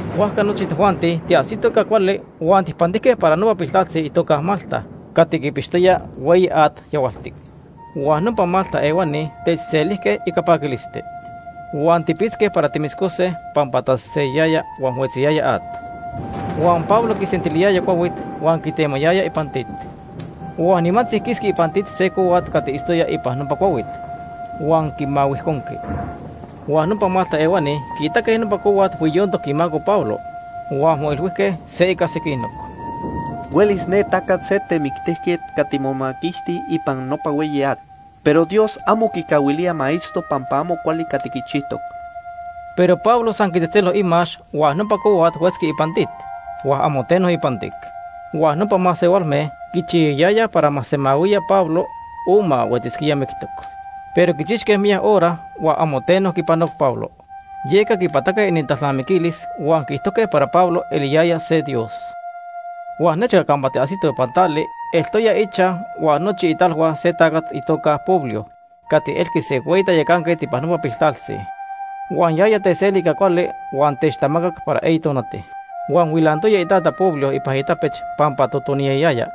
Huajca nochi tojuanti tiajsitoj ica cuali, huan tijpantijque para nopa piltaltzi itoca Malta huan quipixqui hueyi at yahualtic. Huan nopa Malta ehuani techselijque ica paquilisti. Huan tipitzque para timoscose pampa taseseyayaya huan huetziyaya at. Huan Pablo quisentiliyaya cuahuit huan quitemayaya ipan tit. Huan nimantzi quisqui ipan tit se cohuat cati itztoya ipan nopa cuahuit, huan quimahuijconqui. Huan nopa Malta ehuani quiitaque nopa cohuat huiyontoc imaco Pablo huan moilhuijque se ica sequinoc: “Huelis ne tacat se temictijquet cati momaquixti ipan nopa hueyi at, pero Dios amo quicahuilía ma itzto pampa amo cuali cati quichijtoc.” Pero Pablo san quitzejtzelo imax huan nopa cohuat huetzqui ipan tit, huan amo teno ipantic. Huan nopa masehualme quichiyayayaj para ma semahuiya Pablo o ma huetzisquía mictoc. Pero quichixque miyac hora, huan amo teno quipanoc Pablo. Yeca quipataque inintalnamiquilis huan quiijtojque para Pablo eliyaya se dios. Huan nechca campa tiajsitoj ipan tali, eltoya ichaj huan nochi italhua se tacat itoca Publio cati elqui se hueyi tayacanquet ipan nopa piltaltzi. Huan yaya techseli ica cuali huan techtamacac para eyi tonati. Huan huilantoya itata Publio ipan itapech pampa totoniyayaya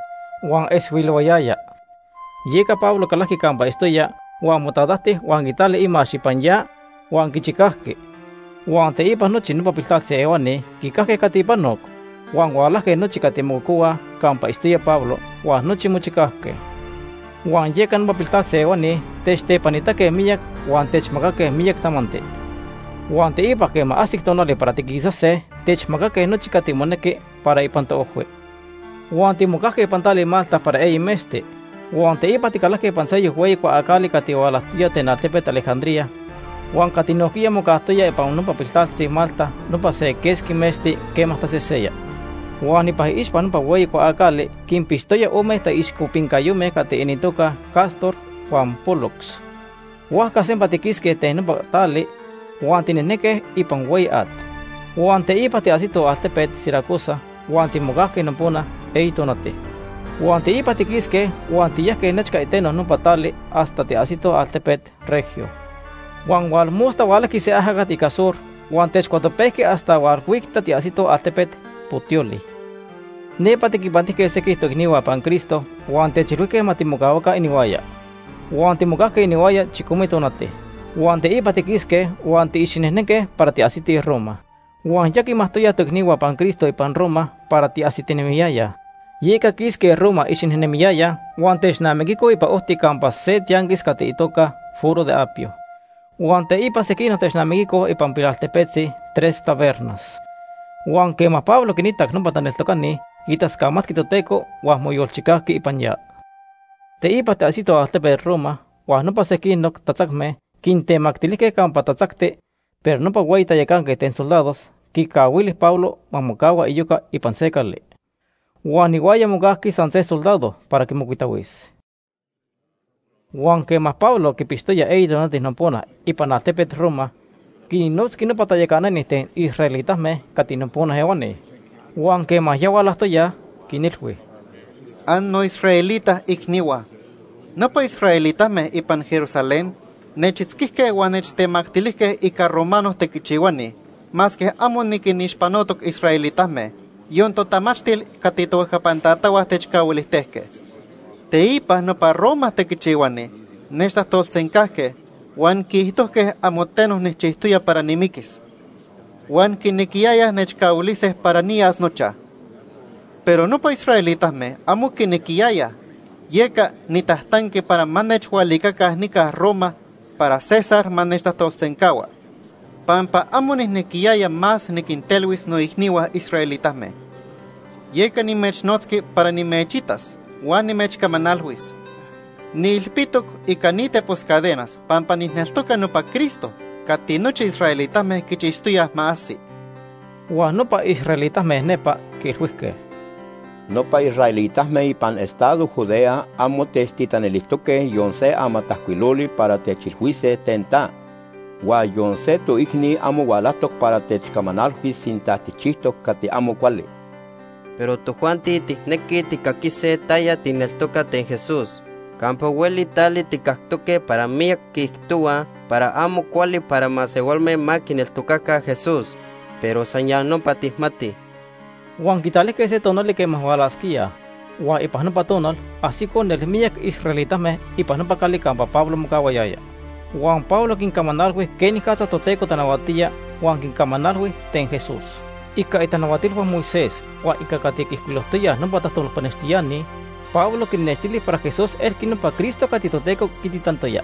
huan moxixayaya esti. Yeca Pablo calajqui campa itztoya, huan motatajti huan quitali imax ipan ya huan quichicajqui. Huan teipa nochi nopa piltaltzi ehuani quicajque cati panoc, huan hualajque nochi cati mococohuaj campa itztoya Pablo huan nochi mochicajque. Huan yeca nopa piltaltzi ehuani techtepanitaque miyac huan techmacaque miyac tamanti. Huan teipa quema ajsic tonali para tiquisase, techmacaque nochi cati monequi para ipan toojhui. Huan timocajque ipan tali Malta para eyi metzti. Huan teipa ticalajque ipan seyoc hueyi cuaacali cati hualajtoya ten altepet Alejandría huan cati nojquiya mocajtoya ipan nopa piltaltzi Malta nopa se quesqui metzti quema taseseya. Huan ipan iixpa nopa hueyi cuaacali quinpixtoya ome taixcopincayome cati inintoca Cástor huan Pólux. Huajca sempa tiquisque ten nopa tali huan tinejnenque ipan hueyi at. Huan teipa tiajsitoj altepet Siracusa huan timocajque nopona eyi tonati. Huan teipa tiquisque huan tiyajque nechca iteno nopa tali hasta tiajsitoj altepet Regio. Huan tonili hualajqui se ajacat ica sur huan techcuatopejqui hasta hualhuicta tiajsitoj altepet Puteoli. Nepa tiquinpantijque sequij toicnihua ipan Cristo huan techilhuijque ma timocahuaca inihuaya. Huan timocajque inihuaya chicome tonati. Huan teipa tiquisque huan tiicxinejnenque para tiajsitij Roma. Huan ya quimajtoyaj toicnihua ipan Cristo ipan Roma para tiajsitinemiyayaj. Yeca quisque Roma icxinejnemiyayaj huan technamiquicoj ipan ojti campa se tianquis cati itoca Foro de Apio. Huan teipa sequinoc technamijque ipan pilaltepetzi Tres Tabernas. Huan quema Pablo quinitac nopa taneltocani, quitascamatqui Toteco huan moyolchicajqui ipan ya. Teipa tiajsitoj altepet Roma huan nopa sequinoc tatzacme quintemactilijque campa tatzacti, pero nopa hueyi tayacanquet ten soldados quicahuili Pablo ma mocahua iyoca ipan se cali. Huan ihuaya mocajqui san se soldado para quimocuitahuis. Huan quema Pablo quipixtoya eyi tonati nopona ipan altepet Roma, quinnotzqui nopa tayacanani ten israelitame cati nopona ehuani. Huan quema hualajtoyaj, quinilhui: ―Annoisraelita icnihua, nopa israelitame ipan Jerusalén nechitzquijque huan nechtemactilijque ica romano tequichihuani masque amo niquinixpanotoc israelitame, yon totamachtil cati tohuejcapan tatahua techcahuilijtejque. Teipa nopa Roma tequichihuani nechtajtolsencajque huan quiijtojque amo teno nijchijtoya para nimiquis. Huan quinequiyayaj nechcahuilise para niyas nochaj. Pero nopa israelitame amo quinequiyayaj, yeca nitajtanqui para ma nechhualicaca nica Roma para César ma nechtajtolsencahua, pampa amo nijnequiyaya más niquintelhuis noicnihua israelitame. Yeca nimechnotzqui para nimechitas huan nimechcamanalhuis. Niilpitoc ica ni tepos cadenas pampa nijneltoca nopa Cristo cati nochi israelitame quichixtoyaj ma ajsi. Huan nopa israelitame nepa quiilhuijque: ―Nopa israelitame ipan estado Judea amo techtitanilijtoque yon se amatajcuiloli para techilhuise ten ta. Huan yon se toicni amo hualajtoc para techcamanalhuis sinta tijchijtoc cati amo cuali. Pero tojuanti tijnequij tijcaquise taya tijneltoca ten Jesús. Campa hueli tali tijcactoque para miyac quiijtohuaj para amo cuali para masehualme ma quineltocaca Jesús. Pero san ya nopa tijmatij. Huan quitalijque se tonali quema hualasquíaj, huan ipan nopa tonal ajsicoj nelmiyac israelitame ipan nopa cali campa Pablo mocahuayaya. Huan Pablo quincamanalhui quenicatza Toteco tanahuatía huan quincamanalhui ten Jesús. Ica itanahuatilhua Moisés huan ica cati quiijcuilojtoyaj nopa tajtolpanextiani, Pablo quinnextili para Jesús elqui nopa Cristo cati Toteco quititantoya.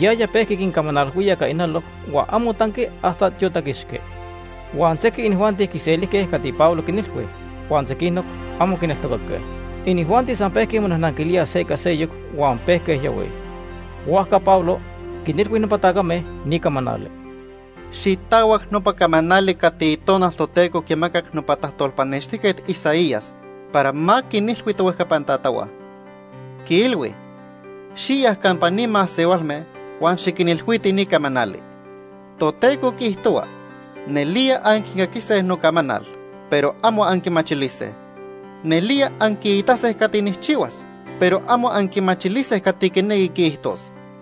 Yaya pejqui quincamanalhuía ica ijnaloc huan amo tanqui hasta tiotaquixqui. Huan sequij inijuanti quiselijque cati Pablo quinilhui, huan sequinoc amo quineltocaque. Inijuanti san pejque monajnanquilíaj se ica seyoc huan pejque yahuij. Huajca Pablo quinilhui nopa tacame ni camanali: ―Xitahuac nopa camanali cati Itonal Toteco quimacac nopa tajtolpanextijquet Isaías para ma quinilhui tohuejcapan tatahua. Quiilhui: ‘Xiya campa ni masehualme huan xiquinilhuiti ni camanali. Toteco quiijtohua: Nelía anquicaquise nocamanal, pero amo anquimachilise. Nelía anquiitase cati nijchihuas, Pero amo anquimachilise cati quinequi quiijtos.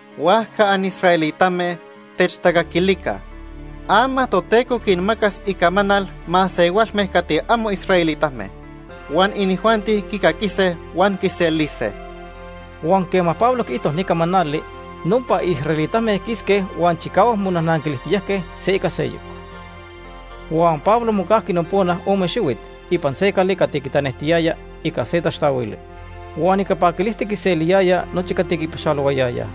―Huajca anisraelitame, techtacaquilica. Ama Toteco quinmacas icamanal masehualme cati amo israelitame. Huan inijuanti quicaquise huan quiselise. Huan quema Pablo quiijto ni camanali, nopa israelitame quisque huan chicahuac monajnanquilijtiyajque se ica seyoc. Huan Pablo mocajqui nopona ome xihuit ipan se cali cati quitanejtiyaya ica se taxtahuili. Huan ica paquilisti quinseliyaya nochi cati quipaxalohuayayaj.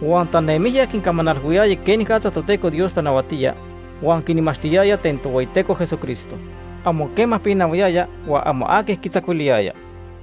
Huan tanemijya quincamanalhuiyaya quenicatza Toteco Dios tanahuatía, huan quinmachtiyaya ten Tohueyiteco Jesucristo. Amo quema pinahuayaya, huan amo aqui quitzacuiliyaya.